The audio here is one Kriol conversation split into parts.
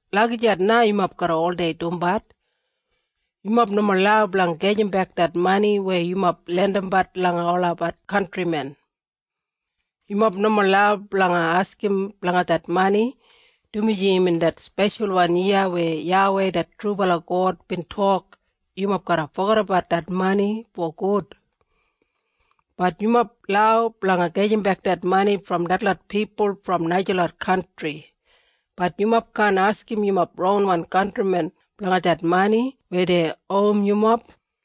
Lagijat na yumob garra oldei dumbat. Yumob nomo lau blanga gajimbek det mani weya yumob lendimbat langa olabat kantrimen. Yumob nomo lau blanga askim blanga det mani, dumaji imbin det speshalwan yiya weya YAWEI det trubala God bin tok yumob garra fogedabat det mani fogud. Bat yumob lau blanga gajimbek det mani brom detlot pipul brom najalot kantri, bat yumob kaan askim yumob ronwan kantrimen blanga det mani weya dei owim yumob.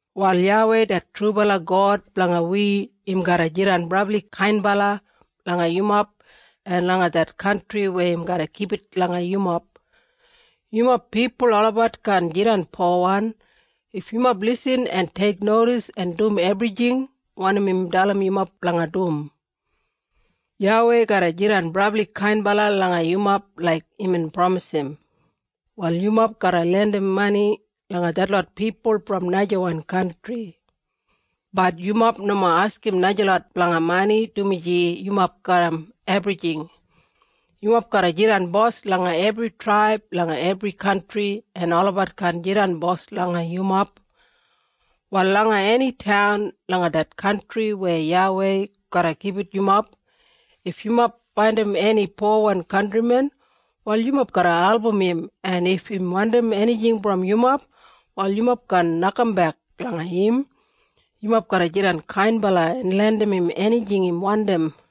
“Wal YAWEI det trubala God blanga wi im garra jidan brabli kainbala langa yumob en langa det kantri weya im garra gibit langa yumob. Yumob pipul olabat kaan jidan powan if yumob lisin en teiknodis en dum ebrijing wanim im dalim yumob blanga dum. YAWEI garra jidan brabli kainbala langa yumob laik imbin pramisim. Wal yumob garra lendim mani langa detlot pipul brom najawan kantri. Bat yumob nomo askim najalot blanga mani dumaji yumob garram ebrijing. Yumob garra jidan bos langa ebri traib langa ebri kantri en olabat kaan jidan bos langa yumob. “Wal langa eni taun langa det kantri weya YAWEI garra gibit yumob, if yumob faindim eni powan kantrimen, wal yumob garra album im en if im wandim enijing brom yumob, wal yumob kaan nokambek langa im. Yumob garra jidan kainbala en lendim im enijing im wandim.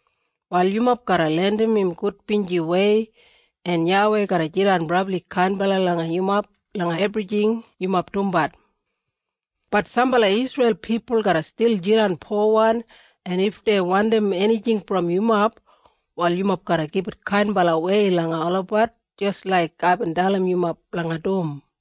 Wal yumob garra lendim im gudbinjiwei en YAWEI garra jidan brabli kainbala langa yumob langa ebrijing yumob dumbat. Bat sambala Isreil pipul garra stil jidan powan en if dei wandim enijing brom yumob, wal yumob garra gibit kainbalawei langa olabat jis laik aibin dalim yumob blanga dum.”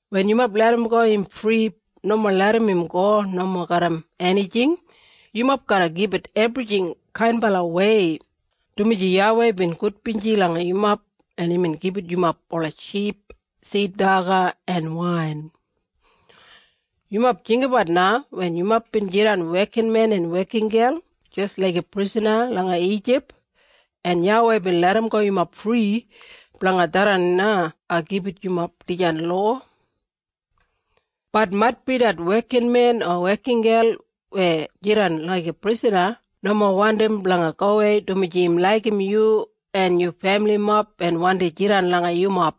Wen yumob larramgo im fri nomo larram im go nomo garram enijing. Yumob garra gibit ebrijing kainbalawei, dumaji YAWEI bin gudbinji langa yumob en imbin gibit yumob ola ship, sid daga, en wain. Yumob jinggabat na wen yumob bin jidan wekinmen en wekingel jis laiga prisana langa Ijip, en YAWEI bin larramgo yumob fri. Blanga tharran na ai gibit yumob dijan lowa. “Bat maitbi det wekinmen o wekingel weya jidan laiga prisana, nomo wandim blanga gowei, dumaji im laigim yu en yu femilimob en wandi jidan langa yumob.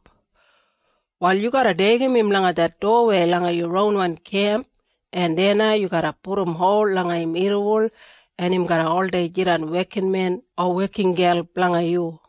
Wal yu garra deigim im langa det dowawei langa yu ronwan kemp, en deya na yu garra pudum hol langa im irriwol, en im garra oldei jidan wekinmen o wekingel blanga yu.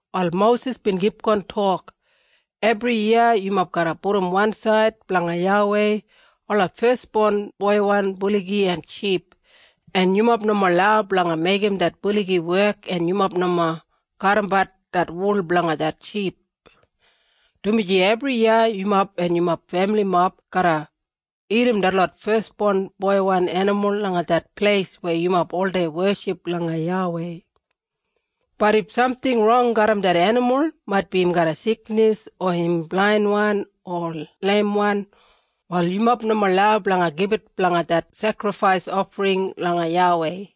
Wal Mosis bin kipgon tok, “Ebriyiya yumob garra pudum wansaid blanga YAWEI ola fesbon boiwan buligi en ship en yumob nomo lau blanga meigim det buligi wek en yumob nomo kadimbat det wul blanga det ship. Dumaji ebriyiya yumob en yumob femilimob garra dagat detlot fesbon boiwan enimul langa det pleis weya yumob oldei weship langa YAWEI. Bat if samting rong garram det enimul, maitbi im garra siknis o im blainwan o leimwan, wal yumob nomo lau blanga gibit blanga det sekrifais ofring langa YAWEI.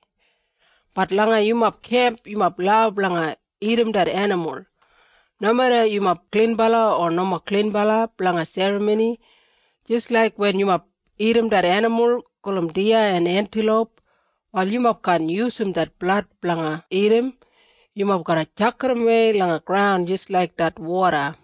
Bat langa yumob kemp yumob lau blanga dagat det enimul. Nomeda yumob klinbala o nomo klinbala blanga serramoni, jis laik wen yumob dagat det enimul gulum diya o entiloup. Wal yumob kaan yusum det blad blanga dagat. Yumob garra tjakidawei langa graun jis laik det woda.”